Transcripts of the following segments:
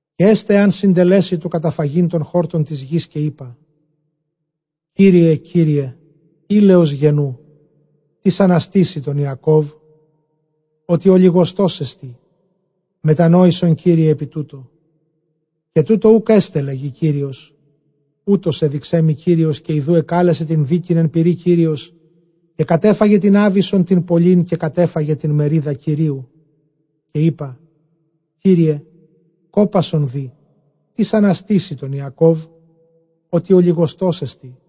Καὶ ἔσται ἐὰν συντελέσῃ τοῦ καταφαγεῖν τὸν χόρτον τῆς γῆς, καὶ εἶπα, Κύριε Κύριε, ἵλεως γενοῦ· τίς ἀναστήσει τὸν Ἰακώβ; ὅτι ὀλιγοστός ἐστι. Μετανόησον Κύριε ἐπὶ τούτῳ. Καὶ τοῦτο οὐκ ἔσται, λέγει Κύριος. Οὕτως ἔδειξέ μοι Κύριος· καὶ ἰδοὺ ἐκάλεσε τὴν δίκην ἐν πυρὶ Κύριος, καὶ κατέφαγε τὴν ἄβυσσον τὴν πολλὴν, καὶ κατέφαγε τὴν μερίδα Κυρίου. Καὶ εἶπα, Κύριε κόπασον δὴ, τίς ἀναστήσει τὸν Ἰακώβ; ὅτι ὀλιγοστός ἐστι.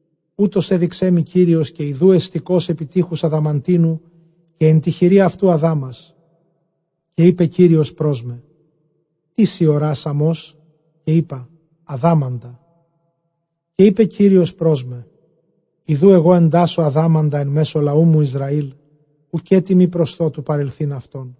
Οὕτως ἔδειξέ μοι Κύριος· καὶ ἰδοὺ ἑστηκὼς ἐπὶ τείχους ἀδαμαντίνου, καὶ ἐν τῇ χειρὶ αὐτοῦ ἀδάμας. Καὶ εἶπε Κύριος πρὸς μὲ, τί σὺ ὁρᾷς Ἀμώς; καὶ εἶπα, ἀδάμαντα· καὶ εἶπε Κύριος πρὸς μὲ, ἰδοὺ ἐγὼ ἐντάσσω ἀδάμαντα ἐν μέσῳ λαοῦ μου Ἰσραὴλ, οὐκ ἔτι μὴ προσθῶ τοῦ παρελθεῖν αὐτόν.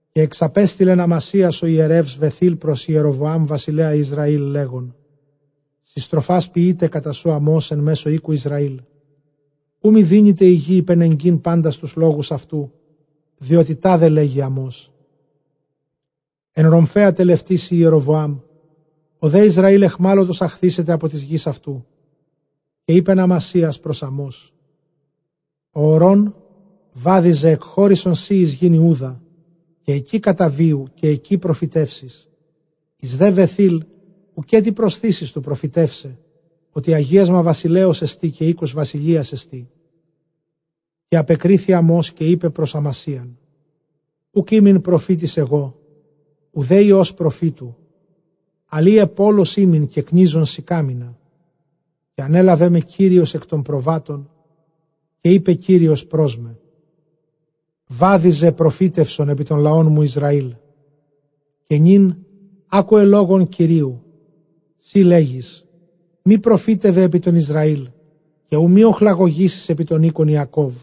Καὶ ἐξαπέστειλεν Ἀμασίας ὁ ἱερεὺς Βαιθὴλ πρὸς Ἱεροβοὰμ βασιλέα Ἰσραὴλ, λέγων, συστροφὰς ποιεῖται κατὰ σοῦ Ἀμὼς ἐν μέσῳ οἴκου Ἰσραὴλ, οὐ μὴ δύνηται ἡ γῆ ὑπενεγκεῖν πάντας τοὺς λόγους αὐτοῦ. Διότι τάδε λέγει Ἀμὼς, ἐν ῥομφαίᾳ τελευτήσει Ἱεροβοὰμ, ὁ δὲ Ἰσραὴλ αἰχμάλωτος ἀχθήσεται ἀπὸ τῆς γῆς αὐτοῦ. Καὶ εἶπεν Ἀμασίας πρὸς Ἀμὼς ὁ ὁρῶν βάδιζε, ἐκχῶρησον σὺ εἰς γῆν Ἰούδα, καὶ ἐκεῖ καταβίου, καὶ ἐκεῖ προφητεύσεις, εἰς δὲ Βαιθὴλ οὐκ ἔτι προσθήσεις τοῦ προφητεῦσαι, ὅτι ἁγίασμα βασιλέως ἐστὶ, καὶ οἶκος βασιλείας ἐστί. Καὶ ἀπεκρίθη Ἀμὼς καὶ εἶπε πρὸς Ἀμασίαν, οὐκ ἤμην προφήτης ἐγὼ, οὐδὲ υἱὸς προφήτου, ἀλλʼ ἢ αἰπόλος ἤμην, καὶ κνίζων συκάμινα· καὶ ἀνέλαβέ με Κύριος ἐκ τῶν προβάτων, καὶ εἶπε Κύριος πρὸς μὲ, βάδιζε, καὶ προφήτευσον ἐπὶ τὸν λαόν μου Ἰσραήλ. Καὶ νῦν ἄκουε λόγον Κυρίου· σὺ λέγεις, μὴ προφήτευε ἐπὶ τὸν Ἰσραὴλ, καὶ οὐ μὴ ὀχλαγωγήσῃς ἐπὶ τὸν οἶκον Ἰακώβ.